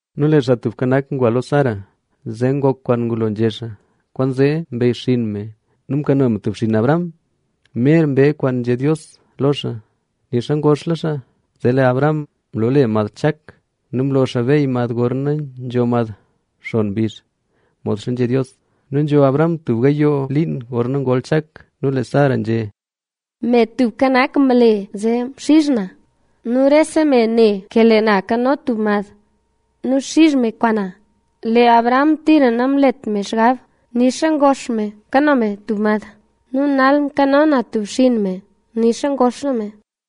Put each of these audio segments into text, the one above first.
Nu lee Xaa Tubka Nak ngwa lo Sara, zee ngok kwaan ngulola nzhé xaa. Kwaanzee mbeyxinn me nu mkano me tub xinn Abraham mer mbee kwaan nzhé Dios lo xaa, nixa ngoxla xaa. Zee lee Abraham mloole mad Chak.a Nu mlo xaa beey mad gorna nzho mad xon mbizh, modxa nzhé Dios. Nu nzho Abraham tub gayoo liin gorna ngol Chak. Nu lee Sara nzhé: —Me Tubka Nak mle zee mxizh na. Nu rese me ne ke lee na nkano tub mad nu xizh me kwaan na. Lee Abraham tira namlet me xgab, nixa ngox me kano me tub mad. Nu nal mkano na tub xinn me nixa ngoxla me.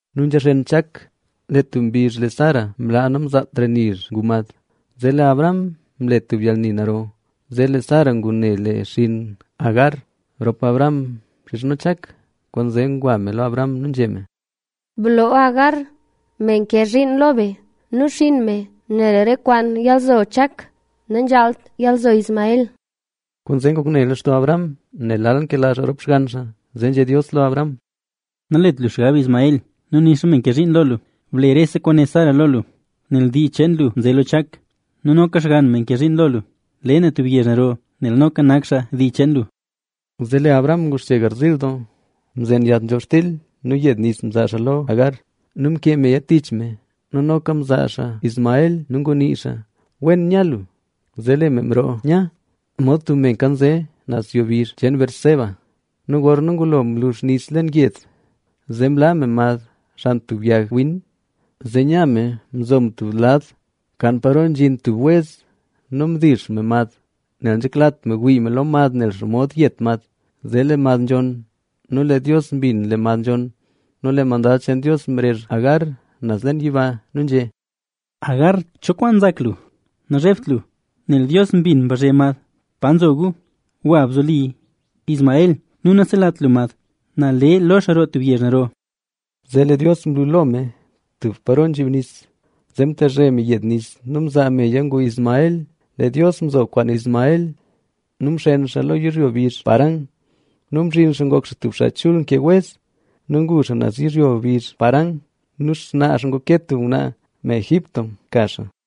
Nu nzha xen Chak, lee tub mbizh lee Sara mlaa namzaatra nizh ngu mad, zee lee Abraham mle tub yalni naro. Zee lee Sara ngune lee xinn Agar rop Abraham mxizhno Chak. Kwaanzee ngwa me lo Abraham nu nzhé me: —Bloo Hagar, me nke zhiin lo be nu xinn me, nel re kwaan yalzo Chak, nanzhaalt yalzo Ismael. Kwaanzee ngok ne lextoo Abraham, nel lal nkela xaa rop xgann xaa. Zee nzhé Dios lo Abraham: —Nalet lu xgab Ismael nu nixa me nke zhiin lo lu. Ble rese kwaan né Sara lo lu, nel dii cheen lu nze lo Chak. Nu noka xgann me nke zhiin lo lu, le na tub yezh naro, nel noka nak xaa dii cheen lu. Zee lee Abraham nguxche garziil doo. Mzen yat nzhob xtil nu yed nis mzaa xaa lo Agar. Nu mkee meya tich me. Nu noka mzaa xaa Ismael nu ngunii xaa: “Wen nya lu”. Zee lee me mroo nya, mod tub me nkanze, naz yo bizh cheen Beerseba. Nu gorna ngulo mlux nis leen yed, zee mlaa me mad xan tub yag win. Zee nya me mzo me tub lad, kan paro nzhin tub wez nu mdix me mad, nel nanzheklat me wii me lo mad nel xomod yet mad. Zee lee mad nzhonn. Nu lee Dios mbin lee mad nzhonn nu lee mandad cheen Dios mrezh Agar naz leen yiba. Nu nzhé: —¿Hagar, cho kwaan nzak lu? Nazhebt lu, nel Dios mbin mbazhe mad pa nzo gu. Gwa nu bzoli Ismael nu naselat lu mad. Na le lo xaa roo tub yezh naro. Zee lee Dios mlu lo me lo tub paro nzhib nis, zee mtezhe me yed nu mzaa meya ngu Ismael. Lee Dios mzo kwaan Ismael nu mxen xaa lo yizhyo mbizh Parán. Nu mzhin xaa ngok xaa tub xaa chul nkee wez. Nu ngu xaa naz yizhyo bizh Parán. Nu xnaa xaa nguke tub ngwnaa me Egipto mka xaa.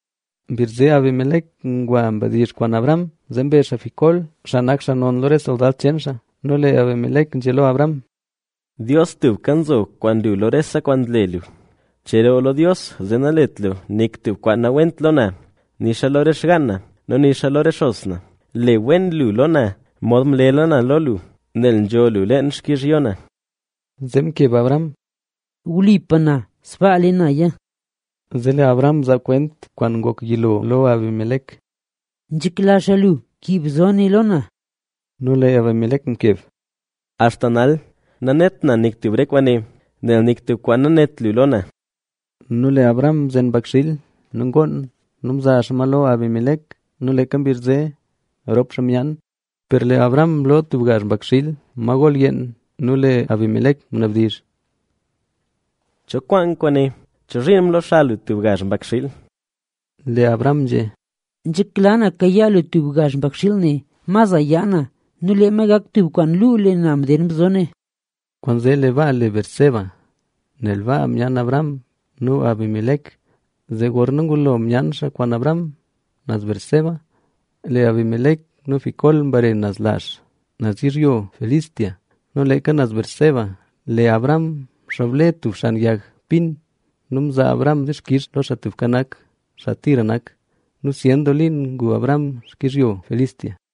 Mbizh zee, Abimelec ngwa mdizh kwaan Abraham, zee mbe xaa Ficol, xaa nak xaa non lo re soldad cheen xaa. Nu lee Abimelec nzhé lo Abraham: —Dios tubka nzo kwaan lu lo rese kwaan nle lu. Cheroo lo Dios zee nalet lu nik tub kwaan nawent lo na, nixa lo re xgaan na nu nixa lo re xos na. Le wen lu lo na mod mlela na lo lu, nel nzho lu leen xkizhyo na. Zee mkeb Abraham: —Wlipa na, sbaa le naya. Zee lee Abraham mzaa kwent kwaan ngok yilo lo Abimelec: —Nzhekla xaa lu kib bzo ne lo na. Nu lee Abimelec mkeb: —Axta nal, nanet na nik tub re kwaane, nel nik tub kwaan nanét lu lo na. Nu lee Abraham mzen mbakxiil nu ngoon nu mzaa xaa ma lo Abimelec. Nu leeka mbizh zee rop xaa myaan. Per lee Abraham mloo tub gazh mbakxiil, ma gol yeen. Nu lee Abimelec ngunabdizh: —¿Cho kwaan kwaane? ¿Chozhiin mloo xa lu tub gazh mbakxiil? Lee Abraham nzhé: —Nzhekla na kayaa lu tub gazh mbakxiil ne, ma za yaa na nu lee ma gak tub kwaan luu lee na mdeen bzo ne. Kwaanzee lee baa le Beerseba,b nel baa mcheroo Abraham nu Abimelec. Zee gorna ngulo myaan xaa kwaan Abraham naz Beerseba, lee Abimelec nu Ficol mbare naz lazh, naz yizhyo Filistea. Nu leeka naz Beerseba, lee Abraham mxoble tub xan yag pin nu mzaa Abraham dixkix lo Xaa Tubka Nak, xaa tira nak. Nu zyen doo liin ngu Abraham xkizhyo Filistea.